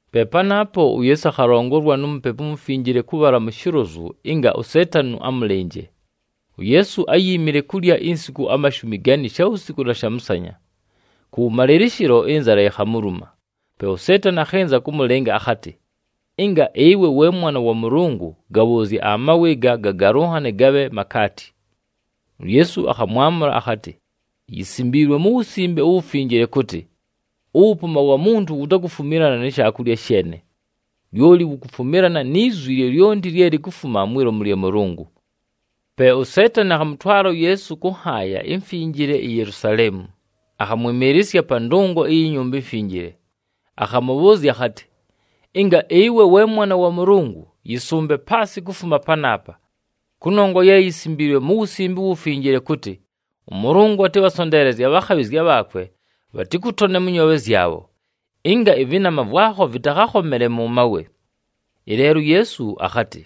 Pe panaapo uYeesu akhalongolwa nu Mupepu uMufinjile kʉbhala mu shilozu ɨnga uSeetani amʉlɨnje. UYeesu áyiimile kulya insiku amashumi gani shawusiku na shamʉsanya. Kʉwʉmalɨlɨshɨlo, ɨnzala yikhamuluma. Pe uSeetani akhɨnza kʉmʉlɨnga akhatɨ, “Ɨnga ɨwe we Mwana wa Mʉlʉngʉ, gabhʉʉzye amawe ɨga gagalʉnhane gabhe makaati.” UYeesu akhamwamʉla akhatɨ, “Yisimbiilwe mu Wusimbe uWufinjile kʉtɨ, ‘Ʉwʉpʉʉma wa muntu wutakufumilana ni shaakulya sheene, lyoli wukufumilana ni zwi lyolyonti lye likufuma mwi lomu lya Mʉlʉngʉ.’” Pe uSeetani akhamʉtwala uYeesu kʉ nhaaya imfinjile iYelusaleemu, akhamwɨmɨɨlɨsya pa ndʉngo iyi Nyumba iMfinjile. Akhamʉbhʉʉzya akhatɨ, “Ɨnga ɨwe we Mwana wa Mʉlʉngʉ, yɨsʉmbe paasɨ kufuma panaapa. Kʉnongwa ye yisimbiilwe mu Wusimbe uWufinjile kʉtɨ, ‘ɄMʉlʉngʉ atɨbhasonteelezye abhakhabhɨzya bhaakwe bhatɨkʉtone mʉ nyoobhe zyabho, ɨnga ɨvɨnama vwakho vɨtakhakhomele mʉ mawe.’” Ɨleelo uYeesu akhatɨ,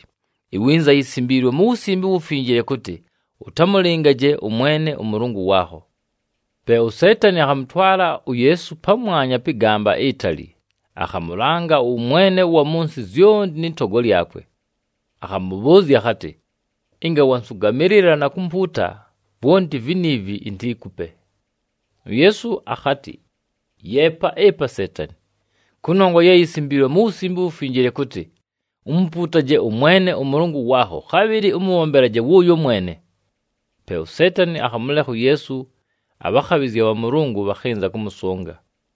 “Iwinza yisimbiilwe mu Wusimbe uWufinjile kʉtɨ, ‘Ʉtamʉlɨngaje ʉMwene ʉMʉlʉngʉ waakho.’” Pe uSeetani akhamʉtwala uYeesu pamwanya pɨ gamba itali, akhamʉlanga ʉwʉmwene ʉwa mʉ nsɨ zyonti nɨ togo lyakwe. Akhamʉbhʉʉzya akhatɨ, “Ɨnga wansʉgamɨlɨla na kumpuuta, vwonti viniivi intiikupe.” UYeesu akhatɨ, “Yeepa ɨpa, Seetani! Kʉnongwa ye yisimbiilwe mu Wusimbe uWufinjile kʉtɨ, ‘Umupuutaje ʉMwene ʉMʉlʉngʉ waakho, khabhɨlɨ ʉmʉbhombelaje wʉʉyo mwene.’” Pe uSeetani akhamʉlekha uYeesu, abhakhabhɨzya bha Mʉlʉngʉ bhakhɨnza kʉmʉsʉnga.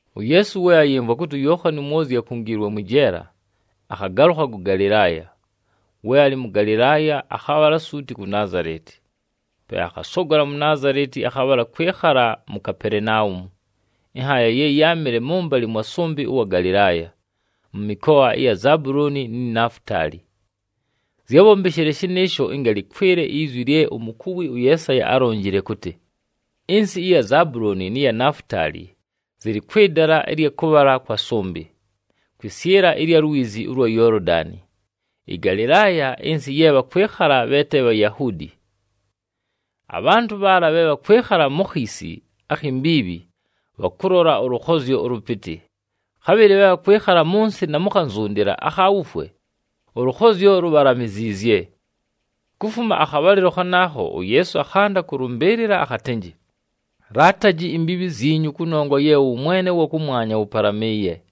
UYeesu we ayɨmvwa kʉtɨ uYookhani uMwozyi akungiilwe mwɨ jeela, akhagalʉkha kʉ Galɨlaaya. We alɨ mʉ Galɨlaaya, akhabhala suuti ku Naazaleti. Pe akhasogola mu Naazaleti, akhabhala kwɨkhala mu Kapelenaumu, ɨnhaaya ye yáamɨle mʉmbalɨ mwa sʉmbɨ ʉwa Galɨlaaya, mʉ mɨkoa ɨya Zabulooni ni Nafutaali. Zyábhombeshile shɨnɨɨsho ɨnga lɨkwɨle izwi lye umukuwi ʉYeesaya álonjile kʉtɨ, “Ɨnsɨ ɨya Zabulooni nɨ ya Nafutaali, zɨlɨ kwɨ dala ɨlya kʉbhala kwa sʉmbɨ, kwɨsyɨla ɨlya lwizi ʉlwa Yoolodani, ɨGalɨlaaya, ɨnsɨ ye bhakwɨkhala bhe te Bhayahuudi. Abhantʉ bhaala bhe bhakwɨkhala mu khiisi akhi mbiibhi, bhalʉlola ʉlʉkhozyo ʉlʉpɨtɨ, khabhɨlɨ bhe bhakwɨkhala mʉ nsɨ, na mu khanzundila akha wufwe, ʉlʉkhozyo lubhalamiziizye.” Kufuma akhabhalɨlo khanaakho, uYeesu akhanda kʉlʉmbɨɨlɨla akhatɨnjɨ, “Laataji imbiibhi zyinyu, kʉnongwa ye ʉwʉmwene ʉwa kʉmwanya wʉpalamɨɨye!”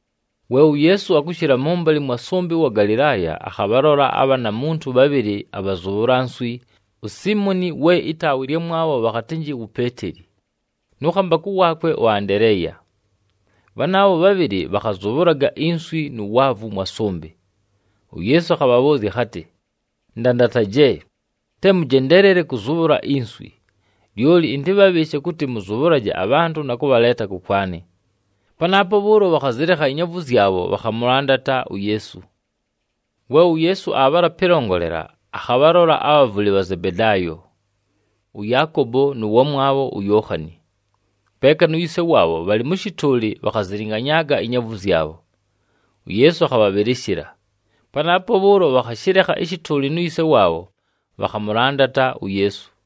We uYeesu akʉshɨla mʉmbalɨ mwa sʉmbɨ ʉwa Galɨlaaya, akhabhalola abhaana muntu bhabhɨlɨ abhazʉbhʉla nswi, uSiimoni we ɨtaawa ɨlyamwabho bhakhatɨnjɨ wu Peeteli nʉ khambakʉ waakwe ʉAndeleeya. Bhanaabho bhabhɨlɨ bhakhazʉbhʉlaga inswi nu waavu mwa sʉmbɨ. UYeesu akhabhabhʉʉzya akhatɨ, “Ndandataje, te mʉjendeelele kʉzʉbhʉla inswi, lyoli ɨntɨbhabhɨɨshe kʉtɨ mʉzʉbhʉlaje abhantʉ na kʉbhaleeta kʉkwanɨ.” Panaapo bhʉʉlo, bhakhazɨlekha inyaavu zyabho, bhakhamʉlandata uYeesu. We uYeesu aabhala pɨlongolela, akhabhalola abhavʉlɨ bha Zebedaayo, ʉYaakobo nʉ wamwabho uYookhani, peeka nu yise waabho bhalɨ mʉ shɨtʉʉlɨ, bhakhazɨlɨnganyaaga inyaavu zyabho. UYeesu akhabhabhɨlɨshɨla. Panaapo bhʉʉlo, bhakhashɨlekha ɨshɨtʉʉlɨ nu yise waabho, bhakhamʉlandata uYeesu.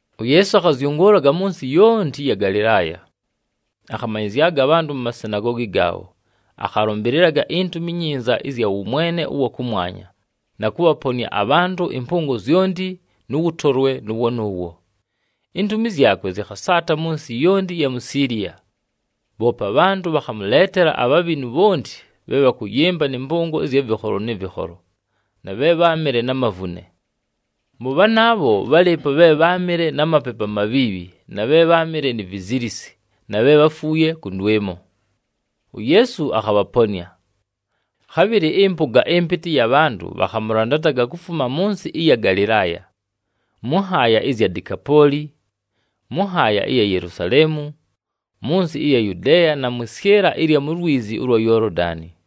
UYeesu akhazyʉngʉʉlaga mʉ nsɨ yonti ɨya Galɨlaaya. Akhamanyɨzyaga abhantʉ mu masinagoogi gaabho, akhalʉmbɨlɨlaga iNtumi iNyinza ɨzya wʉmwene ʉwa kʉmwanya na kʉbhaponɨa abhantʉ ɨmpʉngo zyonti nʉ wʉtolwe nʉʉwo nʉʉwo. Intumi zyakwe zɨkhasaata mʉ nsɨ yonti ɨya mu Siiliya. Bhoope abhantʉ bhakhamʉleetela abhabhinu bhonti bhe bhakʉyɨmba nɨ mpʉngo ɨzya vɨkholo nɨ vɨkholo, na bhe bháamɨle na mavune. Mʉ bhanaabho, bhálɨɨpo bhe bháamɨle na mapepu amabhiibhi na bhe bháamɨle ni vizilisi na bhe bháfuuye kʉndwɨmo. UYeesu akhabhaponɨa. Khabhɨlɨ ɨmpʉga ɨmpɨtɨ ɨya bhantʉ bhakhamʉlandata kufuma mʉ nsɨ ɨya Galɨlaaya, mʉ nhaaya ɨzya Dekapooli, mʉ nhaaya ɨya Yelusaleemu, mʉ nsɨ ɨya Yudeeya na mwɨ syɨla ɨya lwizi ʉlwa Yoolodani.